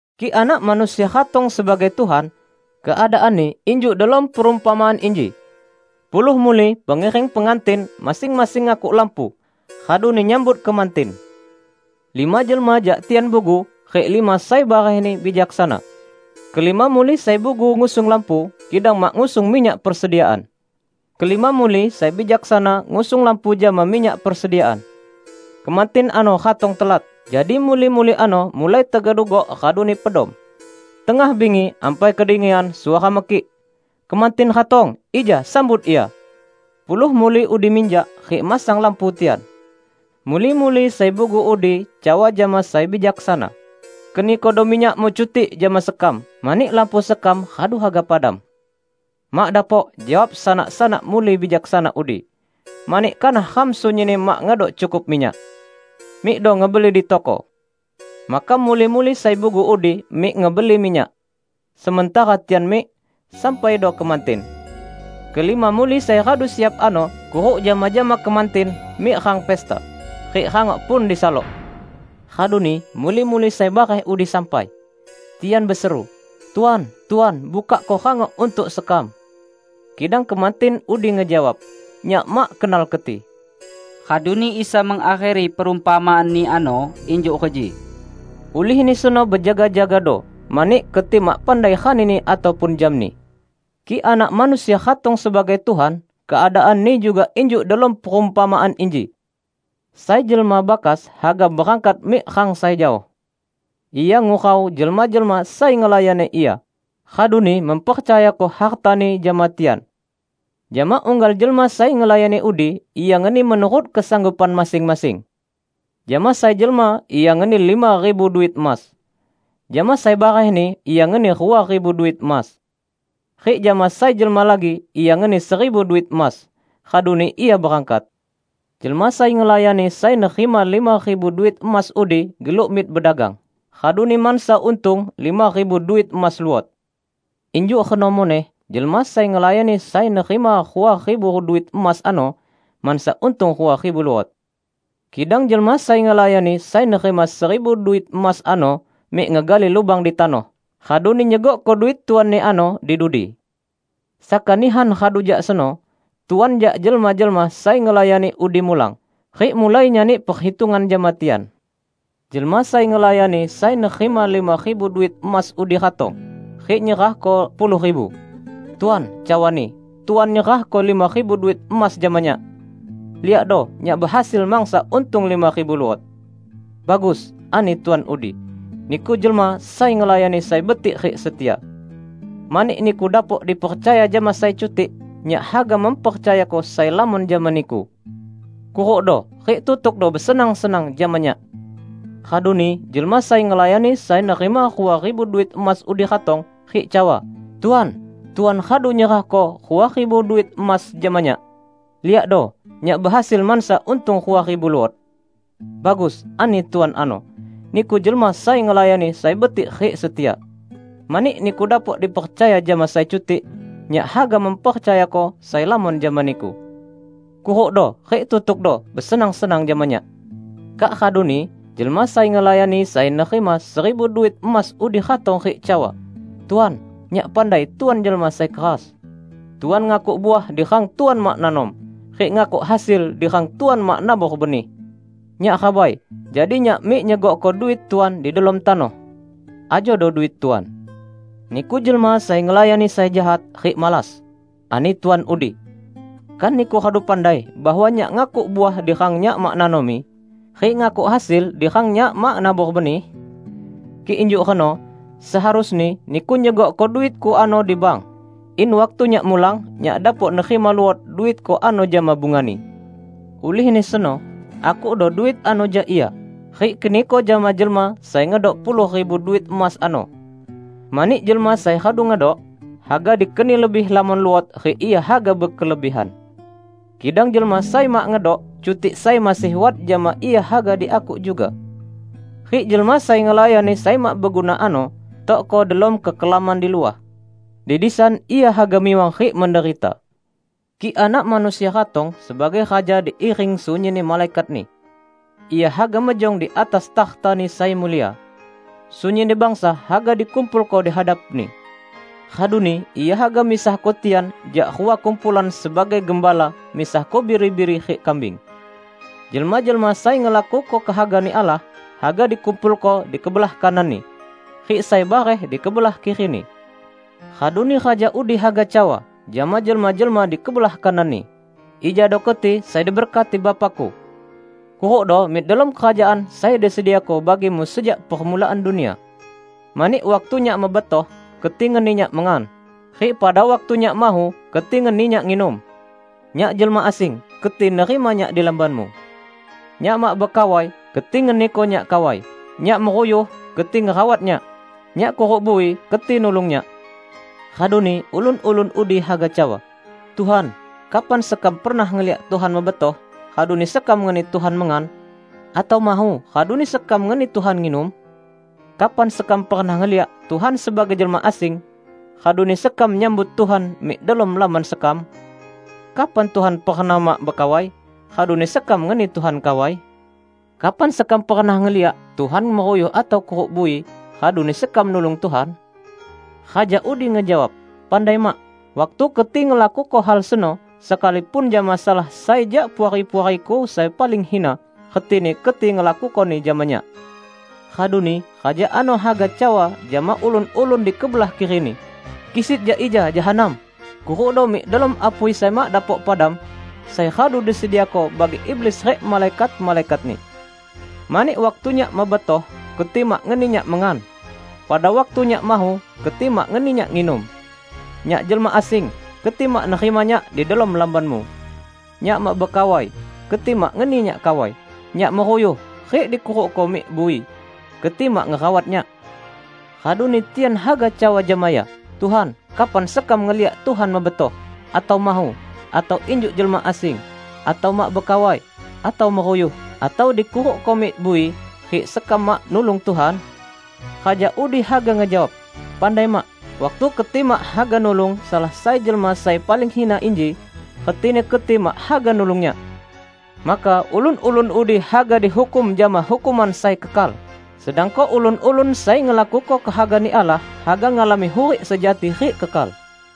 "Kik Anak Manusia ratong sebagai Tuhan, keadaanni injuk delom perumpamaan inji: Puluh muli pengiring pengantin masing-masing ngakuk lampu, raduni nyambut kemantin. Lima jelma jak tian bugu, rik lima sai barehni bijaksana. Kelima muli sai bugu ngusung lampu, kidang mak ngusung minyak persediaan. Kelima muli sai bijaksana ngusung lampu jama minyak persediaan. Kemantin ano ratong telat, jadi muli-muli ano mulai tegedugok raduni pedom. Tengah bingi, ampai kedengian suara mekik, 'Kemantin ratong! Ija sambut ia!' Puluh muli udi minjak, rik masang lampu tian. Muli-muli sai bugu udi cawa jama sai bijaksana, 'Kenikodo minyakmu cutik jama sekam, mani lampu sekam radu haga padam.' 'Mak dapok!' jawab sanak-sanak muli bijaksana udi, 'mani kanah ram sunyinni mak ngedok cukup minyak. Mikdo ngebeli di toko.' Maka muli-muli sai bugu udi mik ngebeli minyak. Sementara tian mik, sampaido kemantin. Kelima muli sai radu siap ano kuruk jama-jama kemantin mik rang pesta, rik rangok pun disalok! Raduni muli-muli sai bareh udi sampai. Tian beseru, 'Tuan, Tuan, bukakko rangok untuk sekam.' Kidang kemantin udi ngejawab, 'Nyak mak kenal keti!' " Raduni Isa mengakheri perumpamaan-Ni ano injuk reji, "Ulihni seno bejaga-jagado, mani keti mak pandai ranini ataupun jamni." "Kik Anak Manusia ratong sebagai Tuhan keadaanni juga injuk delom perumpamaan inji. Sai jelma bakas haga berangkat mik rang sai jaoh. Ia ngurau jelma-jelma sai ngelayani ia, raduni mempercayako hartani jama tian. Jama unggal jelma sai ngelayani udi ia ngeni menurut kesanggupan masing-masing. Jama sai jelma ia ngeni lima ribu duit emas. Jama sai barehni ia ngeni rua ribu duit emas. Rik jama sai jelma lagi ia ngeni seribu duit emas. Raduni ia berangkat. Jelma sai ngelayani sai nerima lima ribu duit emas udi geluk mik bedagang, raduni mansa untung lima ribu duit emas luot. Injuk reno muneh jelma sai ngelayani sai nerima rua ribu duit emas ano mansa untung rua ribu luot. Kidang jelma sai ngelayani sai nerima seribu duit emas ano mik ngegali lubang di tanoh, raduni nyegokko duit tuanni ano di dudi. Saka nihan radu jak seno, tuan jak jelma-jelma sai ngelayani udi mulang, rik mulai nyani perhitungan jama tian. Jelma sai ngelayani sai nerima lima ribu duit emas udi ratong, rik nyerahko puluh ribu. 'Tuan,' cawani, 'Tuan nyerahko lima ribu duit emas jama nyak. Liakdo, nyak behasil mansa untung lima ribu luot.' 'Bagus,' ani tuan udi, 'niku jelma sai ngelayani sai betik rik setia. Mani niku dapok dipercaya jama sai cutik, nyak haga mempercayako sai lamon jama niku. Kurukdo rik tutukdo besenang-senang jama nyak!' Raduni jelma sai ngelayani sai nerima rua ribu duit emas udi ratong, rik cawa, 'Tuan, Tuan radu nyerahko rua ribu duit emas jama nyak. Liakdo, nyak behasil mansa untung rua ribu luot.' 'Bagus,' ani tuan ano, 'niku jelma sai ngelayani sai betik rik setia. Mani niku dapok dipercaya jama sai cutik, nyak haga mempercayako sai lamon jama niku. Kurukdo rik tutukdo besenang-senang jama nyak!' Kak raduni jelma sai ngelayani sai nerima seribu duit emas udi ratong rik cawa, 'Tuan, nyak pandai Tuan jelma sai keras. Tuan ngakuk uah di rang Tuan mak nanom, rik ngakuk hasil di rang Tuan mak nabor benih. Nyak rabai, jadi nyak mik nyegokko duit Tuan di delom tanoh. Ajodo duit Tuan.' 'Niku jelma sai ngelayani sai jahat rik malas!' ani tuan udi. 'Kan niku radu pandai bahwa nyak ngakuk uah di rang nyak mak nanomi, rik ngakuk hasil di rang nyak mak nabor benih? Kik injuk reno, seharusni niku nyegokko duitku ano di bank, in waktu nyak mulang, nyak dapok nerima luot duitku ano jama bungani. Ulihni seno, akukdo duit ano jak ia, rik keniko jama jelma sai ngedok puluh ribu duit emas ano. Mani jelma sai radu ngedok, haga dikeni lebih lamon luot rik ia haga bekelebihan. Kidang jelma sai mak ngedok, cutik sai masih wat jama ia haga diakuk juga. Rik jelma sai ngelayani sai mak beguna ano, tokko delom kekelaman di luah. Di disan ia haga miwang rik menderita!' " "Kik Anak Manusia ratong sebagai Raja diiring sunyinni malaikat-Ni, Ia haga mejong di atas takhta-Ni sai mulia. Sunyinni bangsa haga dikumpulko dihadap-Ni. Raduni Ia haga misahko tian jak rua kumpulan sebagai gembala misahko biri-biri rik kambing. Jelma-jelma sai ngelakuko kehaga-Ni Allah haga dikumpulko di kebelah kanan-Ni, rik sai bareh di kebelah kiri-Ni. Raduni Raja udi haga cawa jama jelma-jelma di kebelah kanan-Ni, 'Ijado keti sai diberkati Bapa-Ku. Kurukdo mik delom Kerajaan sai disediako bagimu sejak permulaan dunia. Mani waktu Nyak mebetoh, keti ngeni Nyak mengan, rik pada waktu Nyak mahu, keti ngeni Nyak nginum. Nyak jelma asing, keti nerima Nyak di lambanmu. Nyak mak bekawai, keti ngeniko Nyak kawai. Nyak meruyuh, keti ngerawat Nyak. Nyak kuruk bui, keti nulung Nyak.' Raduni ulun-ulun udi haga cawa, 'Tuhan, kapan sekam pernah ngeliak Tuhan mebetoh raduni sekam ngeni Tuhan mengan, atau mahu raduni sekam ngeni Tuhan nginum? Kapan sekam pernah ngeliak Tuhan sebagai jelma asing, raduni sekam nyambut Tuhan mik delom lamban sekam? Kapan Tuhan pernah mak bekawai, raduni sekam ngeni Tuhan kawai? Kapan sekam pernah ngeliak Tuhan meruyuh atau kuruk bui, raduni sekam nulung Tuhan?' Raja udi ngejawab, 'Pandai mak: waktu keti ngelakuko hal seno, sekalipun jama salah sai jak puari-puari-Ku sai paling hina, retini keti ngelakukoni jama Nyak!' Raduni Raja ano haga cawa jama ulun-ulun di kebelah kiri-Ni, 'Kisit jak ija, jahanam! Kurukdo mik delom apui sai mak dapok padam, sai radu disediako bagi iblis rik malaikat-malaikatni! Mani waktu Nyak mebetoh, keti mak ngeni Nyak mengan; pada waktu Nyak mahu, keti mak ngeni Nyak nginum. Nyak jelma asing, keti mak nerima Nyak di delom lambanmu. Nyak mak bekawai, keti mak ngeni Nyak kawai. Nyak meruyuh rik dikurukko mik bui, keti mak ngerawat Nyak.' Raduni tian haga cawa jama Ia, 'Tuhan, kapan sekam ngeliak Tuhan mebetoh, atau mahu, atau injuk jelma asing, atau mak bekawai, atau meruyuh, atau dikurukko mik bui, rik sekam mak nulung Tuhan?' Raja udi haga ngejawab, 'Pandai mak: waktu keti mak haga nulung salah sai jelma sai paling hina inji, retini keti mak haga nulung Nyak.' Maka ulun-ulun udi haga dihukum jama hukuman sai kekal, sedangko ulun-ulun sai ngelakuko kehaga-Ni Allah haga ngalami hurik sejati rik kekal."